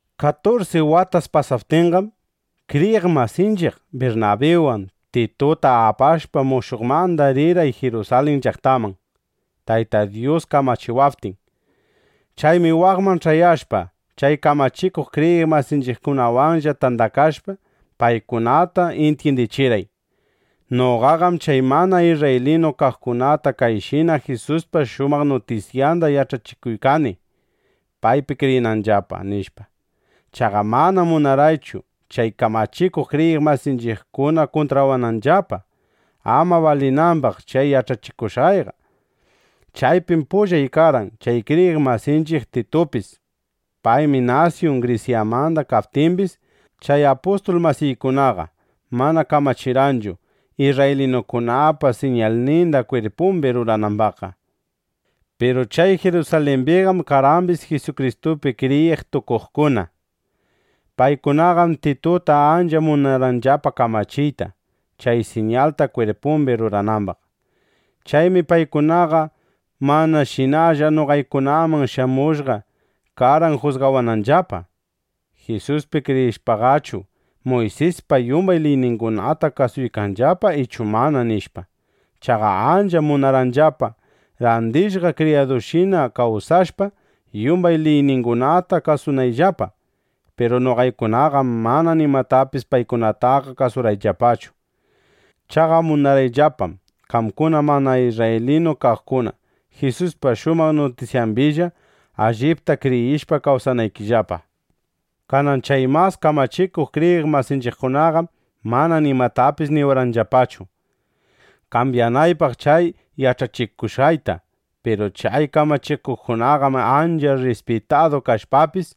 Katursi watas pasaptinqam, kriyiq masinchiq Birnabiwan Tituta apashpa, mushuqmanda ririrqay Jirusalin llaqtaman, Tayta Dyus kamachiwaptin. Chaymi waqman ch'ayashpaqa, chay kamachikuq kriyiq masinchiqkunawanlla tandakashpa, paykunata intyindichirqay: “Noqaqam chay mana isrraylinu kaqkunata kayshina Jisuspa shumaq nutisyanda yach'achiykani, paypi kriyinanllapa”, nishpa. Chaqa manam munarqaychu chay kamachikuq kriyiq masinchiqkuna kuntrawananllapa, ama balinambaq chay yach'achikushqayqa. Chaypim pullay karqan chay kriyiq masinchiq Titupis. Paymi nasyun Grisyamanda kaptimbis, chay apustul masiykunaqa mana kamachirqanchu, isrraylinukunapa siñalninda kwirpumbi ruranambaqqa. Piru chay Jirusalimbiqam karqambis Jisukristupi kriyiq tukuqkuna. Paykunaqam Tituta ancha munarqanllapa kamachiyta, chay siñalta kwirpumbi ruranambaq. Chaymi paykunaqa manashinalla noqaykunaman shamushqa karqan jusgawananllapa: Jisuspi kriyishpaqachu, Muysispa yumbay liyningunata kasuykanllapa ichu mana, nishpa. Chaqa ancham munarqanllapa, randishqa kriyadushina kawsashpa, yumbay liyningunata kasunayllapa. Piru noqaykunaqam mana nimatapis paykunataqa kasurqayllapachu. Chaqa munarqayllapam, qamkuna mana isrraylinu kaqkuna Jisuspa shumaq nutisyambilla allipta kriyishpa kawsanaykillapa. Kanan chay mas kamachikuq kriyiq masinchiqkunaqam mana nimatapis niwarqanllapachu, kambyanaypaq chay yach'achikushqayta. Piru chay kamachikuqkunaqam ancha rrispitadu kashpapis,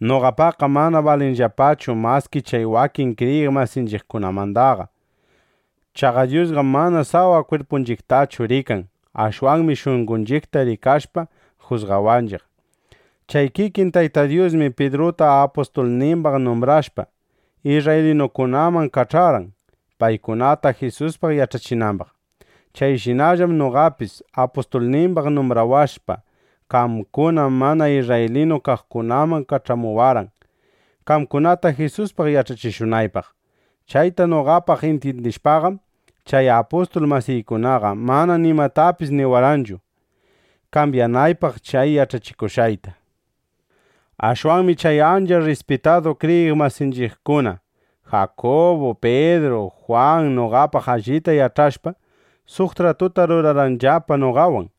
noqapaqqa mana balinllapachu maski chay wakin kriyiq masinchiqmandaqa. Chaqa Dyusqam mana sawa kwirpunchiqtallachu rikan. (Ashwanmi shunqonchiqta rikashpa, jusgawanchiq.) Chay kikin Tayta Dyusmi Pidruta apustulnimbaq numbrashpa, isrraylinukunaman kach'arqan, paykunata Jisuspaq yach'achinambaq. Chayshinallam noqatapis apustulnimbaq numbrawashpa, qamkuna mana isrraylinu kaqkunaman kach'amuwarqan, qamkunata Jisuspaq yach'achishunaypaq. Chayta noqapaq intyindishpaqam, chay apustul masiykunaqa mana nimatapis niwarqanchu, kambyanaypaq chay yach'achikushqayta. Ashwanmi chay ancha rrispitadu kriyiq masinchiqkuna Jakubu, Pidru, Jwan noqapaq allita yach'ashpa, suq tratuta rurarqanllapa noqawan,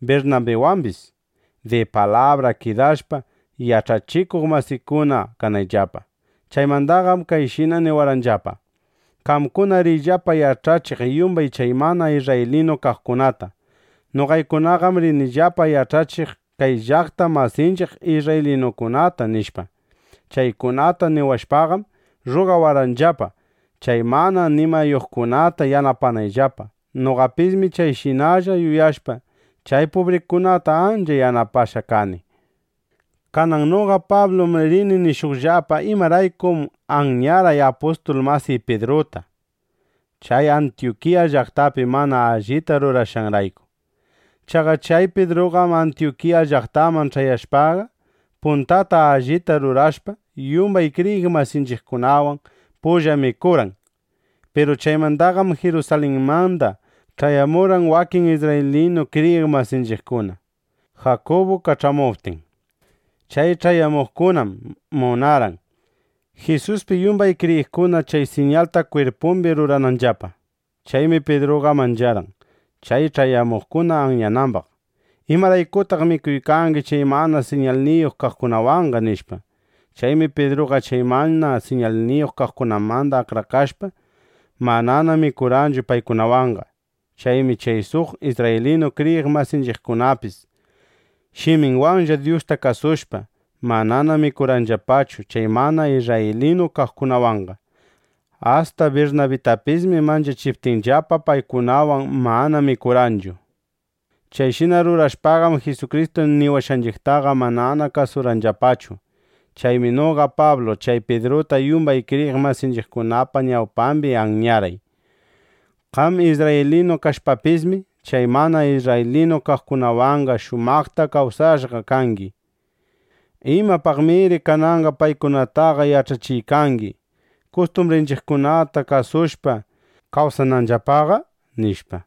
Birnabiwambis, di palabra kidashpa, yach'achikuq masikuna kanayllapa. [Nuta: Pidrullam Sifaspis shutiq.] Chaymandaqam kayshina niwarqanllapa: —Qamkuna riyllapa yach'achiq yumbay chay mana isrraylinu kaqkunata. Noqaykunaqam rinillapa yach'achiq kay llaqta masinchiq isrraylinukunata, nishpa. Chaykunata niwashpaqam rrugawarqanllapa, chay mana nimayuqkunata yanapanayllapa. Noqapismi chayshinalla yuyashpa, chay pubrikunata ancha yanapashqa kani. Kanan noqa Pablum rini nishuqllapa imaraykum anyarqay apustul masiy Pidruta, chay Antyukiya llaqtapi mana allita rurashqanrayku. Chaqa chay Pidruqam Antyukiya llaqtaman ch'ayashpaqa, puntata allita rurashpa, yumbay kriyiq masinchiqkunawan pulla mikurqan. Piru chaymandaqam Jirusalinmanda ch'ayamurqan wakin isrraylinu kriyiq masinchiqkuna, Jakubu kach'amuptin. Chay ch'ayamuqkunam munarqan, Jisuspi yumbay kriyiqkuna chay siñalta kwirpumbi rurananllapa. Chaymi Pidruqa mancharqan, chay ch'ayamuqkuna anyanambaq: “¿Imaraykutaq mikuykangi chay mana siñalniyuq kaqkunawanqa?” nishpa. Chaymi Pidruqa chay mana siñalniyuq kaqkunamanda akrakashpa, manana mikurqanchu paykunawanqa. Chaymi chay suq isrraylinu kriyiq masinchiqkunapis, shiminwanlla Dyusta kasushpa, manana mikurqanllapachu chay mana isrraylinu kaqkunawanqa. Asta Birnabitapismi manchachiptinllapa, paykunawan manana mikurqanchu. Chayshina rurashpaqam, Jisukristu niwashqanchiqtaqa manana kasurqanllapachu. Chaymi noqa Pablu chay Pidruta yumbay kriyiq masinchiqkunapa ñawpambi anyarqay: “Qam isrraylinu kashpapismi, chay mana isrraylinu kaqkunawanqa shumaqta kawsashqa kangi. ¿Imapaqnamiri kananqa paykunataqa yach'achiykangi, kustumbrinchiqkunata kasushpa, kawsananllapaqa?” nishpa.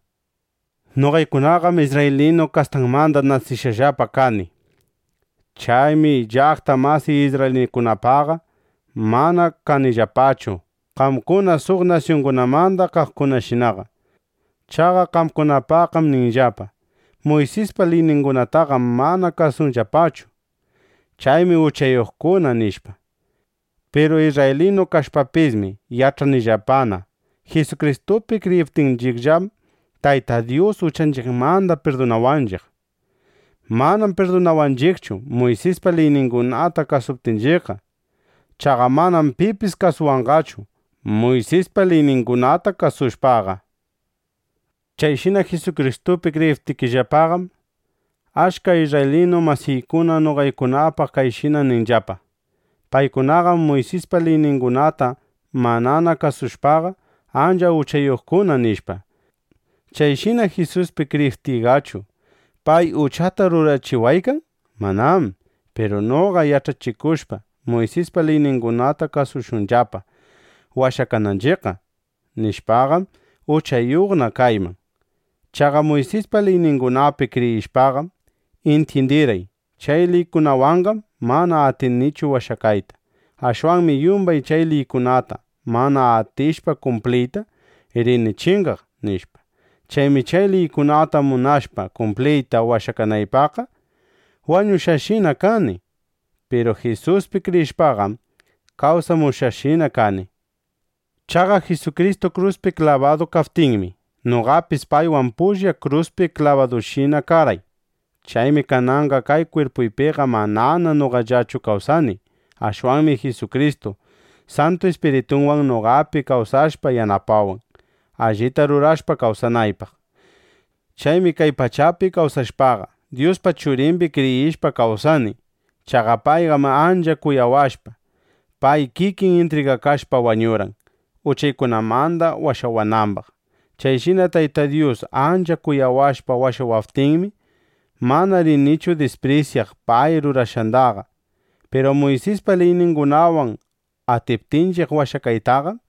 Noqaykunaqam isrraylinu kastamanda nasishqallapa kani. Chaymi llaqta masiy isrraylinukunapaqqa mana kanillapachu qamkuna suq nasyungunamanda kaqkunashinaqa. Chaqa qamkunapaqqam ninllapa: “Muysispa liyningunataqam mana kasunllapachu. Chaymi uchayuqkuna”, nishpa. Piru isrraylinu kashpapismi yach'anillapana: Jisukristupi kriyiptinchiqllam, Tayta Dyus uchanchiqmanda pirdunawanchiq. Manam pirdunawanchiqchu, Muysispa liyningunata kasuptinchiqqa. Chaqa manam pipis washakanqachu Muysispa liyningunata kasushpaqa. Chayshina Jisukristupi kriyiptiyllapaqam, achka isrraylinu masiykuna noqaykunapaq kayshina ninllapa: “Paykunaqam Muysispa liyningunata manana kasushpaqa, ancha uchayuqkuna”, nishpa. ¿Chayshina Jisuspi kriyiptiyqachu, pay uchata rurachiwaykan? ¡Manám! Piru noqa yach'achikushpa: “Muysispa liyningunata kasushunllapa washakananchiqqa”, nishpaqam, uchayuqna kayman. Chaqa Muysispa liyningunapi kriyishpaqam intyindirqay: Chay liykunawanqam mana atinichu washakayta. Ashwanmi yumbay chay liykunata mana atishpa kumpliyta, rini chingaq, nishpa. Chaymi chay liykunata munashpa kumpliyta washakanaypaqqa, wañushqashina kani. Piru Jisuspi kriyishpaqam, kawsamushqashina kani. Chaqa Jisukristu kruspi klabadu kaptinmi, noqapis paywan pulla kruspi klabadushina karqay. Chaymi kananqa kay kwirpuypiqa manana noqallachu kawsani. Ashwanmi Jisukristu Santu Ispiritunwan noqapi kawsashpa yanapawan, allita rurashpa kawsanaypaq. Chaymi kay pachapi kawsashpaqa, Dyuspa Churimbi kriyishpa kawsani. Chaqa payqam ancha kuyawashpa, pay kikin intrigakashpa wañurqan, uchaykunamanda washawanambaq. Chayshina Tayta Dyus ancha kuyawashpa washawaptinmi, mana rinichu disprisyaq pay rurashqandaqa. Piru Muysispa liyningunawan atiptinchiq washakaytaqam,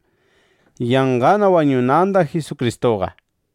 yanqana wañunanda Jisukristuqa.